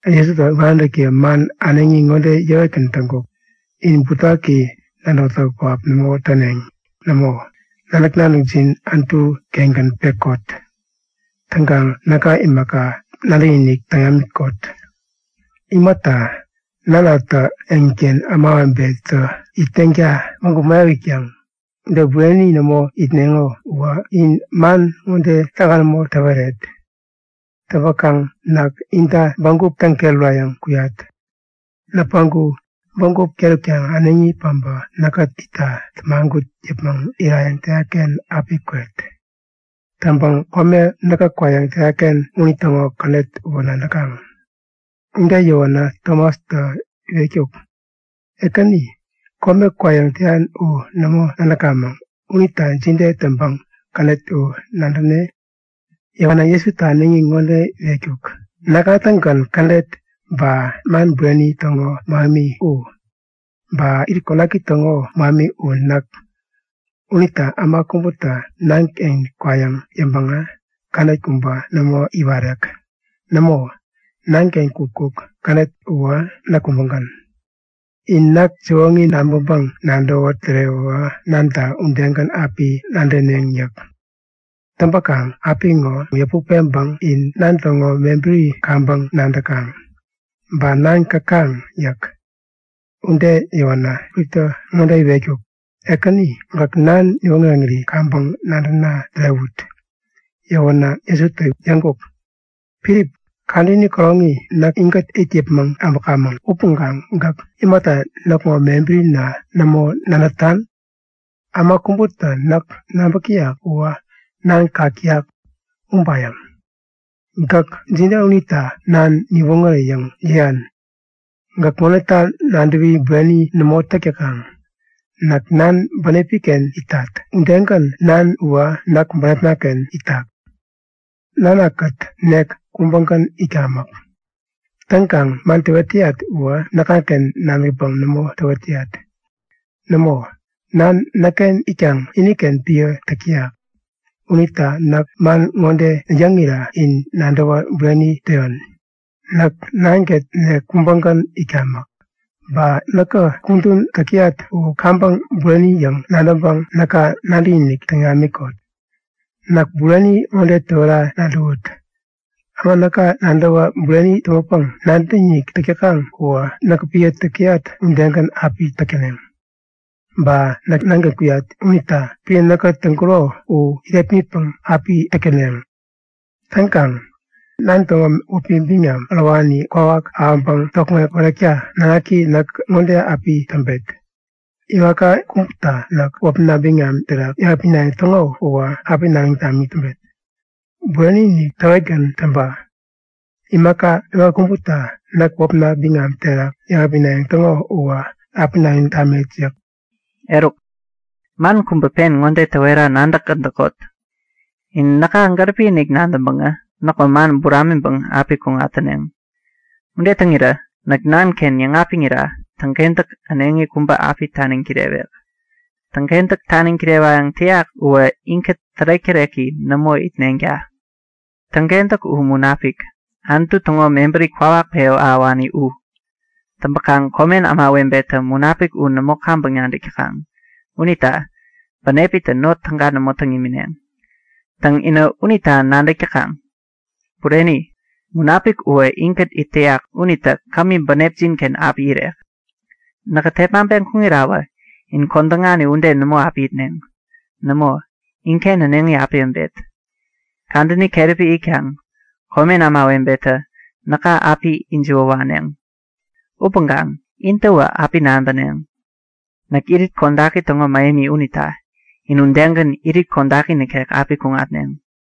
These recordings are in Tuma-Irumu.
Jesutä iwaräntäkiye man äneŋi ŋode yäwetgän täŋkuk; In butewaki nadäwätäk pähap nämo täneŋ. Nämo, nadäk-nadäkjin Anutu-kengän pekot. Täŋkaŋ näka imaka, nadäkinik täŋ namikot. Imata, Nanatä eŋiken ämawebetä itneŋta bägup mäyap itkaŋ. Ude bureni nämo itneŋo uwä in man ŋode täga nämo täweret. Täŋpäkaŋ näk inta bägup täŋket urayäŋ kuyat. Näkä päŋku bägup ket utkaŋ äneŋi päbä näkkät itta tämagut yäpmäŋ irayäŋ täyat-ken api kwet. Täŋpäŋ kome näkä kwayäŋ täyat-ken unitäŋo kädet uwä nadäkaŋ. Ude yäwänä, Tomastä iwetkuk; Ekäni, kome kwayäŋ täyan u nämo nadäkamäŋ unita jide täŋpäŋ kädet u nadäne? Yäwänä Jesutä ŋode yäwetkuk; Näkŋa-tägän kädet. Ba man bureni täŋo mähemi u näk. Ba irit kodaki täŋo mähemi u näk. Unita äma kubätä Nanken kwayäŋ yäŋpäŋä kädet kubä nämo iwarek. Nämo, Nanken kukkuk kädet uwä näk kubägän. In näk siwoŋi nabäŋpäŋ-nadäwä tärewäwä Nanta udegän api nadäneŋ yäk. Täŋpäkaŋ apiŋo yäput peŋpäŋ in Nan täŋo mebäri kaŋpäŋ nadäkaŋ. Ba Nan käkaŋ yäk. Ude yäwänä Filiptä ŋode iwetkuk; Ekäni, gäk Nan niwoŋäreŋiri kaŋpäŋ nadäna tärewut! Yäwänä Jesutä yäŋkuk; Filip, kadäni käroŋi näk inkät it yäpmäŋ äbäkamäŋ upäŋkaŋ gäk imata näkŋo mebärina nämo nadätan? Äma kubätä näk nabäk täyak uwä Nan kak täyak ubayäŋ. Gäk jide unita Nan niwoŋäre yäŋ yäyan? Gäk ŋodeta nadäwi bureni nämo täk täkaŋ? Näk Nan bänepi-ken itat, udegän Nan uwä näk bänepna-ken itak. Nankät nek kubägän itkamäk. Täŋkaŋ man täwet täyat uwä näkŋaken nadäkpäŋ nämo täwet täyat. Nämo, Nan näkken itkaŋ iniken epän täk täyak. Unita näk man ŋode yäŋira in nadäwä bureni täyon; Näk Nankät nek kubägän itkamäk. Ba näkä kudän täk täyat u kaŋpäŋ bureni yäŋ nadäŋpäŋ näka nadäkinik täŋ namikot. Näk bureni ŋode täwera nadäwut; Äma näka nadäwä bureni täŋpäpäŋ nadäkinik täk täkaŋ uwä näkä epän täk täyat udegän api täk täneŋ. Ba näk Nanken kuyat unita epän näkä täŋkuro u irepmitpäŋ api täk täneŋ. Täŋkaŋ Nan täŋo wäpi biŋam ärowani kwawak ahäŋpäŋ tokŋeŋ pärekta Nanaki näkä ŋode api täŋpet; Imaka kubäta näk wäpna biŋam terak yäŋapinayäŋ täŋo uwä api nadäŋ tamik täŋpet. Bureni-inik täwetgän täŋpa; Imaka kubäta näk wäpna biŋam terak yäŋapinayäŋ täŋo uwä api nadäŋ tamet yäk. Eruk man kubä pen ŋode täwera nadäkgän täkot; In näka gäripi-inik nadäŋpäŋä näkŋo man buramiŋpäŋ api kuŋat täneŋ. Ude täŋirä näk Nanken yäŋapiŋira täŋkentäk äneŋi kubä api taniŋ kirewek. Täŋkentäk taniŋ kirewayäŋ täyak uwä inkät tärek-täreki nämo itneŋta. Täŋkentäk u Munapik, Anutu täŋo mebäri kwawak pewän ahäwani u. Täŋpäkaŋ komen ämawebetä Munapik u nämo kaŋpäŋ nadäk täkaŋ unita bänepitä not täga nämo täŋ imineŋ. Täŋ, inä unita nadäk täkaŋ. Bureni, Munapik uwä inkät it täyak unitä kämi bänepjin-ken api irek. Näkä tepmaŋpeŋ kuŋirawä in kodäŋani ude nämo api itneŋ. Nämo, inken äneŋi api äbet. Kadäni keräpi itkaŋ komen ämawebetä näka api ijiwä waneŋ. Upäŋkaŋ intäwä api nabäneŋ. Näk irit kodaki täŋo mähemi unita in udegän irit kodaki nikek api kuŋatneŋ.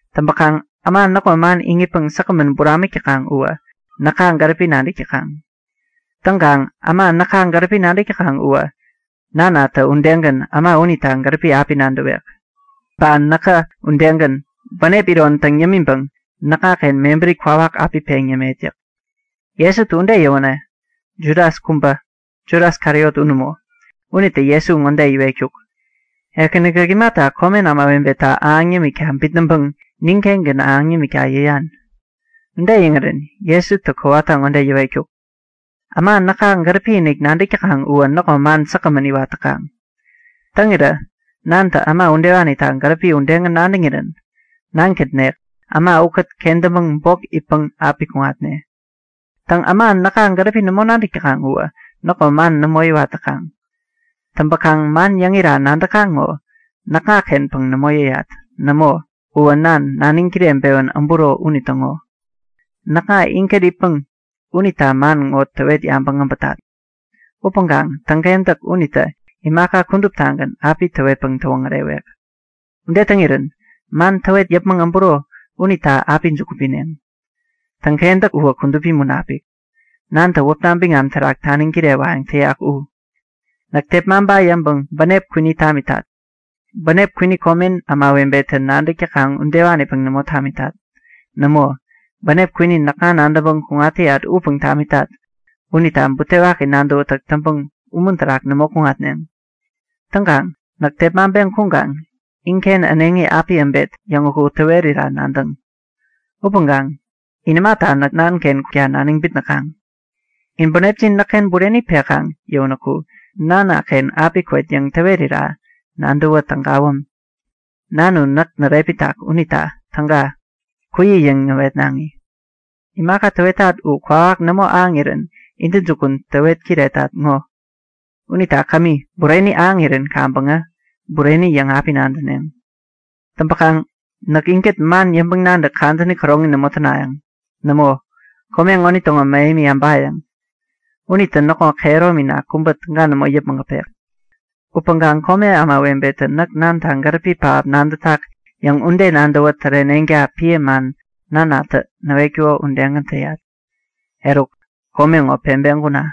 Täŋpäkaŋ äma näkŋo man iŋitpäŋ säkgämän buramik täkaŋ uwä näka gäripi nadäk täkaŋ. Täŋkaŋ äma näka gäripi nadäk täkaŋ uwä Nanatä udegän äma unita gäripi api nadäwek. Ba näkä udegän, bänep iron täŋ yämiŋpäŋ näkŋaken mebäri kwawak api peŋ yämet yäk. Jesutä ude yäwänä Judas kubä (Judas Kariot u nämo), unitä Jesu ŋode iwetkuk; Ekäni, gäk imata komen ämawebeta ahäŋ yämikta bitnäŋpäŋ nin-kengän ahäŋ nimikta yäyan? Ude yäŋirän Jesutä kowata ŋode yäwetkuk; Äma näka gäripi-inik nadäk täkaŋ uwä näkŋo man säkgämän iwat täkaŋ. Täŋirä Nantä äma udewanita gäripi udegän nadäŋirän Nankät nek äma ukät kentäŋpäŋ bok itpäŋ api kuŋatne. Täŋ, äma näka gäripi nämo nadäk täkaŋ uwä näkŋo man nämo iwat täkaŋ. Täŋpäkaŋ man yäŋira nadäkaŋ ŋo näkŋa-kenpäŋ nämo yäyat. Nämo, uwä Nan, naniŋ kireŋpewän äburo unitäŋo. Näkŋa inkät itpäŋ unita man ŋo täwet yäpmäŋ äbätat. Upäŋkaŋ Täŋkentäk unitä imaka kuduptagän api täwetpäŋ täwoŋärewek. Ude täŋirän man täwet yäpmäŋ äburo unita api juku pineŋ. Täŋkentäk uwä Kudupi Munapik, Nantä wäpna biŋam terak taniŋ kirewayäŋ täyak u. Näk tepmaŋpa yäŋpäŋ bänep kwini tamitat. Bänep kwini komen ämawebetä nadäk täkaŋ udewanipäŋ nämo tamitat. Nämo, bänep kwini näkŋa nadäŋpäŋ kuŋat täyat upäŋ tamitat unita butewaki nadäwätäk täŋpäŋ umun terak nämo kuŋatneŋ. Täŋkaŋ näk tepmaŋpeŋ kuŋkaŋ inken äneŋi api äbet yäŋ uku täwerira nadäŋ. Upäŋkaŋ in imata näk Nanaken kukta naniŋ bitnäkaŋ? In bänepjin näkken bureni pekaŋ yäwänäku Nanaken api kwet yäŋ täwerira nadäwä tägawäm. Nan u näk närepmitak unita täga, kuyi yäŋ näwetnaŋi. Imaka täwetat u kwawak nämo ahäŋirän intäjukun täwet kiretat ŋo. Unita kämi, bureni ahäŋirän kaŋpäŋä bureni yäŋ api nadäneŋ. Täŋpäkaŋ näk inkät man yäŋpäŋ-nadäk kadäni käroŋi nämo tänayäŋ. Nämo, kome ŋonitäŋo mähemi äbayäŋ. Unitä näkŋo kehäromina kubä täga nämo yäpmäŋ äpek. Upäŋkaŋ komen ämawebetä näk Nanta gäripi pähap nadätak yäŋ ude nadäwä täreneŋta epän man Nanatä näwetkuko udegän täyat. Eruk, kome ŋo peŋpeŋ kuna!